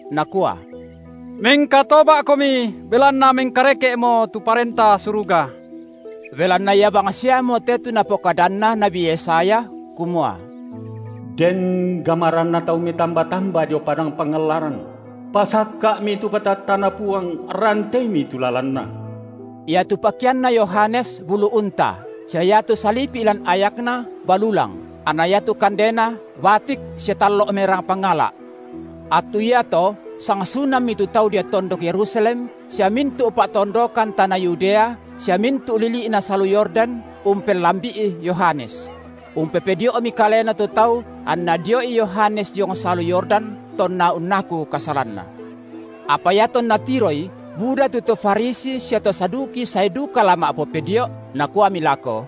nakua: Mengkatoba’komi, belanna mengkareke’mo tu Parenta Suruga. Belanna ia bangsiamote tu napokadanna nabi Yesaya, kumua: Den gamaranna tau metamba-tamba dio padang pangallaran: Pasakka’mi tu batattaNa Puang, ranteimi tu lalanNa. Iatu pakeanna Yohanes bulu unta, sia iatu salipi’ lan ayakna balulang, anna iatu kandena batik sia tallo’ merang pangala’. Attu iato sang sunammi tu tau dio tondok Yerusalem sia mintu’ pa’tondokan tana Yudea sia mintu’ lili’na salu Yordan umpellambi’i Yohanes; umpopedio’mi kalena tu tau anna dio’i Yohanes diong salu Yordan tonna unnaku kasalanna. Apa iatonna tiroi, buda tu to Farisi sia to Saduki sae duka la ma’popedio’, nakuami lako: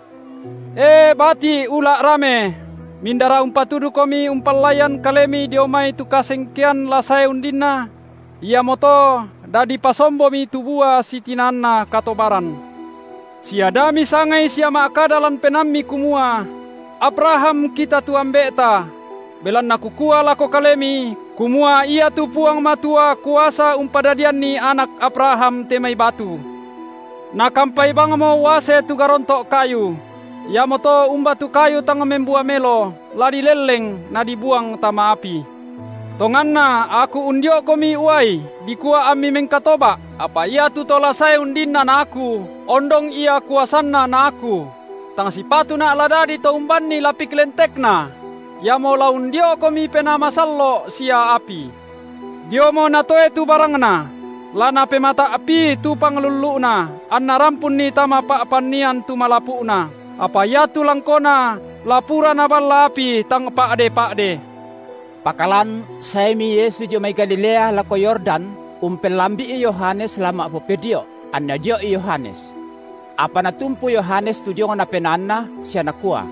E bati’ ula’ rame, mindara umpatudukomi umpallaian kalemi dio mai tu kasengkean la sae undinna? Iamoto dadi pasombomi tu bua sitinaanna katobaran. Sia da misangai sia ma’kada lan penaammi kumua: Abraham kita tu ambe’ta; belanna kukua lako kalemi, kumua iatu Puang Matua kuasa umpadadianni anak Abraham te mai batu. Nakampai bangmo uase tu garonto’ kayu; iamoto umba tu kayu tang membua melo, la dilelleng na dibuang tama api. Tonganna aku undio’komi uai dikua ammi mengkatoba’, apa iatu To la sae undinna na aku, ondong Ia kuasanNa na aku; tang sipatuna’ la dadi to umbanni lapik lentekNa; Iamo la undio’komi Penaa Masallo’ sia api. Diomo Natoe tu barangNa; la Napemata’pii tu panglullu’Na, anNa rampunni tama pa’pannian tu malapu’na, apa iatu langkona la pura Naballa api tang pa’de-pa’de. Pakalan saemi Yesu dio mai Galilea lako Yordan umpellambi’i Yohanes la ma’popedio’, anna dio’i Yohanes. Apa natumpu Yohanes tu diongna penaanNa sia nakua: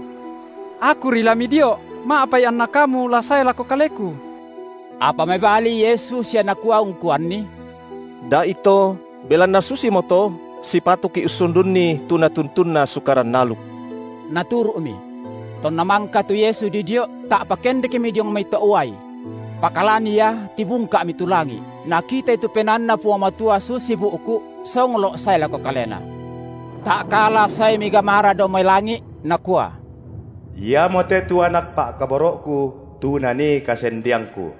Akuri la Midio’, ma’apai anna Kamu la sae lako kaleku! Apa mebali Yesu sia Nakua ungkuanni: Da’ito belanna susimoto sipatuki’ ussundunni tu natuntunna sukaran aluk. Naturu’Mi. Tonna mangka tu Yesu didio’, ta’pa kendekmi diong mai to’ uai; pakalan ia tibungka’mi tu langi’, Nakitai tu PenaanNa Puang Matua susi bu’ku’ songlo’ sae lako Kalena. Ta’kala saemi gamara dao mai langi’, nakua: Iamote tu Anak Pa’kaboro’Ku, tu Nanii kasendeangKu.